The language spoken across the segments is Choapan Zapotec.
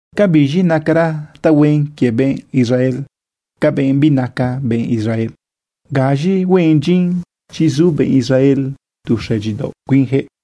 ¿Ca biz̃i nacara tahuen quie benꞌ Israel ca benꞌ binaca benꞌ Israel? ¿Gaz̃i huen dyin chi zu benꞌ Israel tu xëdyidaoꞌ cuinjëꞌ?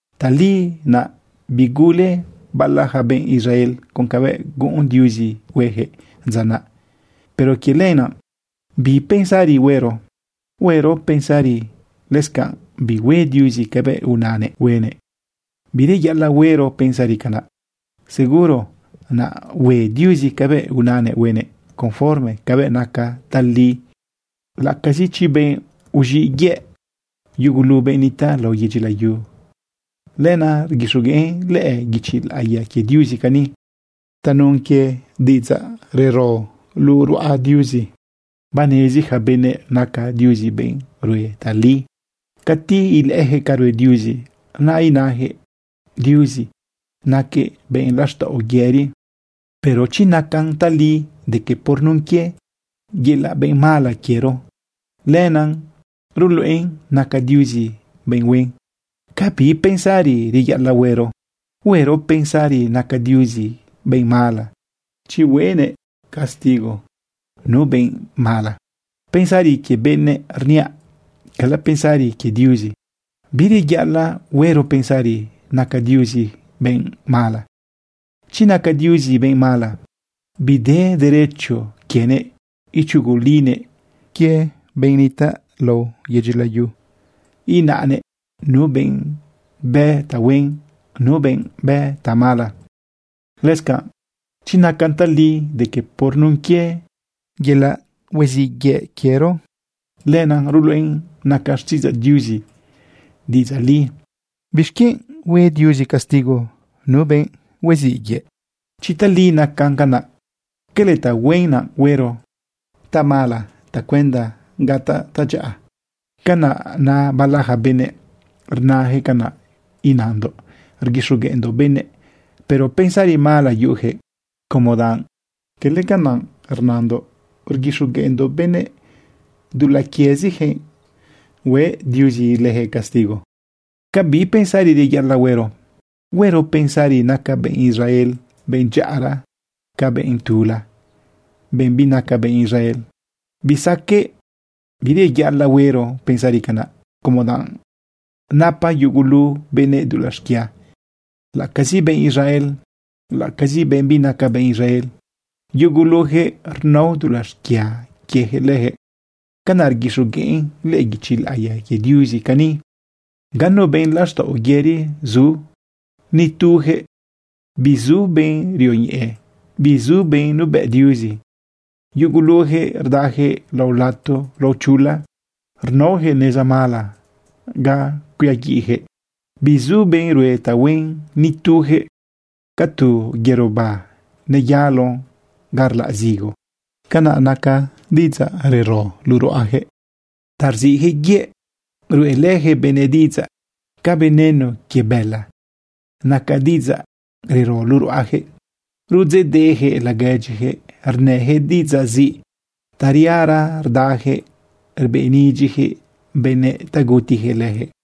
Tali naꞌ bigule bala ja benꞌ Israel con cabëꞌ guꞌun Diuzi huejëꞌ dza naꞌ, pero quie lenaꞌ, ¿bi pensari huero? ¿Huero pensari lëscanꞌ bihue Diuzi cabëꞌ unanëꞌ huenëꞌ? ¡Bireyaꞌalaꞌ huero pensari canaꞌ! Seguro naꞌ hue Diuzi cabëꞌ unanëꞌ huenëꞌ conforme cabëꞌ naca tali, laꞌacazi chi benꞌ huiziꞌ yëꞌ yugulu benꞌ nitaꞌ lao yedyi layu. Lenaꞌ rguixogueꞌn lëꞌë guichi laꞌiya quie Diuzi cani: Tanun quie diꞌidzaꞌ rero luꞌu ruꞌa Diuzi, banezi ja benëꞌ naca Diuzi benꞌ rue tali. Cati ilëꞌëyaquëꞌ ca rue Diuzi, naꞌ inajëꞌ: “Diuzi naquëꞌ benꞌ laxtaꞌo yëri.” Pero chi nacan tali de que por nun quie yelaꞌ benꞌ mala quiero, lenaꞌ ruluꞌen naca Diuzi benꞌ huen, ¿ca bi pensari reyaꞌalaꞌ huero? ¿Huero pensari naca Diuzi benꞌ mala chi huenëꞌ castigo nu benꞌ mala? (Pensari quie benëꞌ rniaꞌ, cala pensari quie Diuzi.) Bireyaꞌalaꞌ huero pensari naca Diuzi benꞌ mala. Chi naca Diuzi benꞌ mala, bide derecho quienëꞌ ichugulinëꞌ benꞌ nitaꞌ lao yedyi layu, inanëꞌ nu benꞌ bë tahuen, nu benꞌ bë tamala. Lëscanꞌ chi nacan tali de que por nun quie yelaꞌ huiziꞌ yëꞌ quiero, lenaꞌ ruluꞌen naca xtiꞌidzaꞌ Diuzi diꞌidzaꞌ li, ¿bixquienꞌ hue Diuzi castigo nu benꞌ huiziꞌ yëꞌ? Chi tali nacan canaꞌ, ¿cala tahuen naꞌ huero tamala tacuenda gataꞌ tadyaꞌa? Canaꞌ na bala ja benëꞌ, rnajëꞌ canaꞌ inandoꞌ rguixogueꞌndoꞌ benëꞌ. Pero pensari mala yuꞌujëꞌ, como danꞌ cala canaꞌ inandoꞌ rguixogueꞌndoꞌ benëꞌ. Dulaꞌ quiezijëꞌ hue Diuzi lëjëꞌ castigo. ¿Ca bi pensari reyaꞌalaꞌ huero? ¿Huero pensari naca benꞌ Israel benꞌ dyaꞌara ca benꞌ tula, benꞌ binaca benꞌ Israel? ¡Bisaqueꞌ! Bireyaꞌalaꞌ huero pensari canaꞌ, como danꞌ napa yugulu benëꞌ dulaꞌ xquia, laꞌacazi benꞌ Israel, laꞌacazi benꞌ binaca benꞌ Israel. Yugulujëꞌ rnao dulaꞌ xquia quiejëꞌ lëjëꞌ. Canaꞌ rguixogueꞌn lëꞌë guichi laꞌiya quie Diuzi cani: Ganu benꞌ laxtaꞌo yëri zu, ni tuyaquëꞌ. Bizu benꞌ rioñeꞌe. Bizu benꞌ nuebëꞌ Diuzi. Yuguluyaquëꞌ rdayaquëꞌ lao lato lao chula. Rnaoyaquëꞌ neza mala ga cuiaguiꞌyaquëꞌ. Bizu benꞌ rue tahuen, ni tuyaquëꞌ. Ca tu yerobá neyalon ga rlaꞌ zigo, canaꞌ naca diꞌidzaꞌ rero luꞌu ruꞌayaquëꞌ. Ta rziꞌjëꞌ yëꞌ ruꞌelëjëꞌ benëꞌ diꞌidzaꞌ. Ca veneno quie bëla naca diꞌidzaꞌ rero luꞌu ruꞌayaquëꞌ. Rudzeꞌdeꞌyaquëꞌ laguedyiyaquëꞌ, rnëjëꞌ diꞌidzaꞌ ziꞌ. Tariara rdayaquëꞌ rbeꞌnidyiyaquëꞌ benëꞌ ta gutiyaquëꞌ leyaquëꞌ.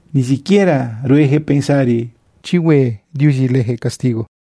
Ni siquiera ruejëꞌ pensari chi hue Diuzi lëjëꞌ castigo.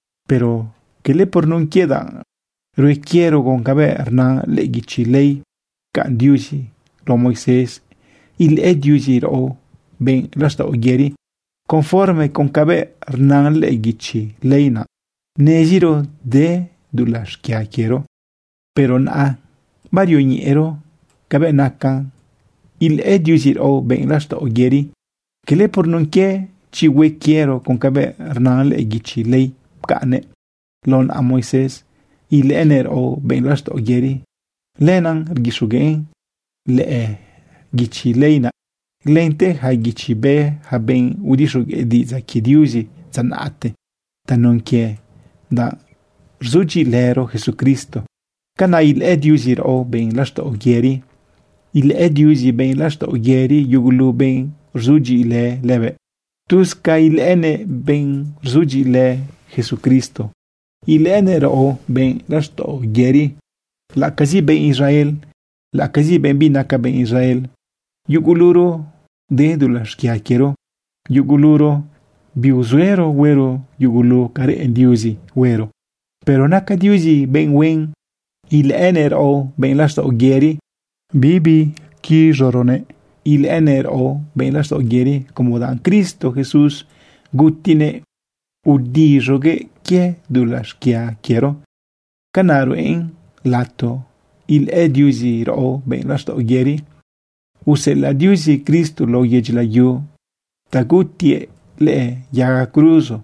Pero quele por nun quie danꞌ rue quiero con cabëꞌ rna lëꞌë guichi ley pcaꞌn Diuzi lao Moisés ilëꞌë Diuzi raꞌo benꞌ laxtaꞌo yëri. Conforme con cabëꞌ rna lëꞌë guichi ley naꞌ neziro de dulaꞌ xquia quiero. Pero naꞌa barioñeꞌero cabëꞌ nacan ilëꞌë Diuzi raꞌo benꞌ laxtaꞌo yëri. Cala por nun quie chi hue quiero con cabëꞌ rna lëꞌë guichi ley pcaꞌnnëꞌ lao naꞌa Moisés ilëꞌënëꞌ raꞌo benꞌ laxtaꞌo yëri. Lenaꞌ rguixogueꞌn lëꞌë guichi ley naꞌ lente ja guichi bë ja benꞌ udixogueꞌ diꞌidzaꞌ quie Diuzi dza naꞌte. Tanun quie danꞌ rzudyiꞌilëro Jesucristo, canaꞌ ilëꞌë Diuzi raꞌo benꞌ laxtaꞌo yëri. Ilëꞌë Diuzi benꞌ laxtaꞌo yëri yugulu benꞌ rzudyiꞌilë lëbëꞌ. Tuz ca ilëꞌënëꞌ benꞌ rzudyiꞌilë Jesucristo, ilëꞌënëꞌ raꞌo benꞌ laxtaꞌo yëri, laꞌacazi benꞌ Israel, laꞌacazi benꞌ binaca benꞌ Israel. Yuguluro de dulaꞌ xquia quiero. Yuguluro biuzuero huero yugulu ca reꞌen Diuzi huero. Pero naca Diuzi benꞌ huen ilëꞌënëꞌ raꞌo benꞌ laxtaꞌo yëri. Bibiquiz̃uroguëꞌ ilëꞌënëꞌ raꞌo benꞌ laxtaꞌo yëri como danꞌ Cristo Jesús gutinëꞌ udiz̃uguëꞌ quie dulaꞌ xquia quiero, canaꞌ ruꞌen lato ilëꞌë Diuzi raꞌo benꞌ laxtaꞌo yëri. Useꞌelaꞌ Diuzi Cristo lao yedyi layu ta gutiëꞌ lëꞌë yaga cruzo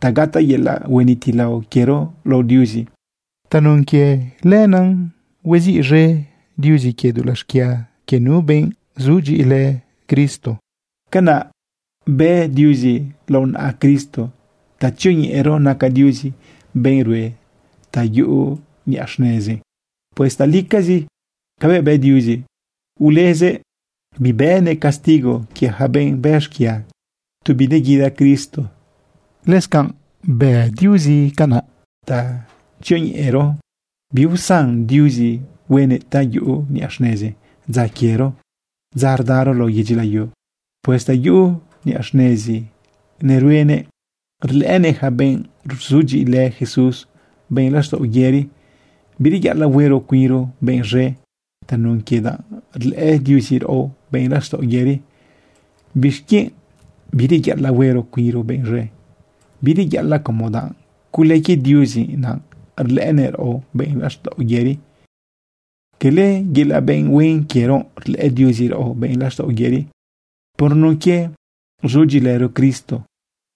ta gataꞌ yelaꞌ huenitilao quiero lao Diuzi. Tanun quie lenaꞌ hueziꞌz̃e Diuzi quie dulaꞌ xquia quie nu benꞌ sudyiꞌilë Cristo. Canaꞌ bë Diuzi lao naꞌa Cristo ta tzioñeꞌero naca Diuzi benꞌ rue ta yuꞌu niꞌa xnezi. Pues talicazi cabëꞌ bë Diuzi, ulezëꞌ bibënëꞌ castigo quie yaca benꞌ bë xquia tu bineguida Cristo. Lëscanꞌ bë Diuzi canaꞌ ta tzioñeꞌero biusan Diuzi huenëꞌ ta yuꞌu niꞌa xnezi dza quiero, dza rdaro lao yedyi layu. Pues ta yuꞌu niꞌa xnezi neruenëꞌ, rlëꞌënëꞌ yaca benꞌ rzudyiꞌilë Jesús benꞌ laxtaꞌo yëri. Bireyaꞌalaꞌ huero cuinro benꞌ z̃e tanun quie danꞌ rlëꞌë Diuzi raꞌo benꞌ laxtaꞌo yëri. ¿Bixquienꞌ bireyaꞌalaꞌ huero cuinro benꞌ z̃e? Bireyaꞌalaꞌ como danꞌ cule quie Diuzi naꞌ rlëꞌënëꞌ raꞌo benꞌ laxtaꞌo yëri, quele yelaꞌ benꞌ huen quiero. Rlëꞌë Diuzi raꞌo benꞌ laxtaꞌo yëri por nun quie rzudyiꞌilëro Cristo,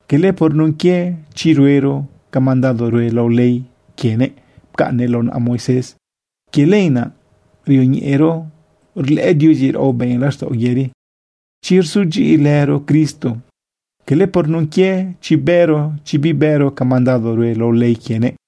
cala por nun quie chi ruero ca mandado rue lao ley quienëꞌ pcaꞌnnëꞌ lao naꞌa Moisés. Quie lenaꞌ rioñeꞌero rlëꞌë Diuzi raꞌo benꞌ laxtaꞌo yëri chi rzudyiꞌilëro Cristo, cala por nun quie chi bëro, chi bibëro ca mandado rue lao ley quienëꞌ.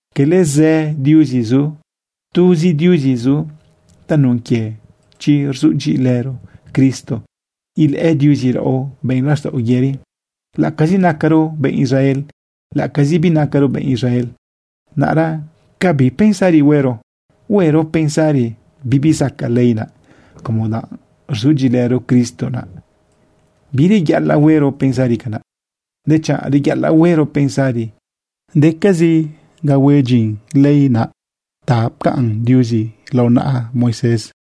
Cala zë diuzi zu, tuzi Diuzi zu. Tanun quie chi rzudyiꞌilëro Cristo ilëꞌë Diuzi raꞌo benꞌ laxtaꞌo yëri, laꞌacazi nacaro benꞌ Israel, laꞌacazi binacaro benꞌ Israel. Naꞌra ¿ca bi pensari huero? ¿Huero pensari bibi zacaꞌ ley naꞌ, como danꞌ rzudyiꞌilëro Cristo naꞌa? Bireyaꞌalaꞌ huero pensari canaꞌ, dechanꞌ reyaꞌalaꞌ huero pensari decazi ga huen dyin ley naꞌ ta pcaꞌn Diuzi lao naꞌa Moisés.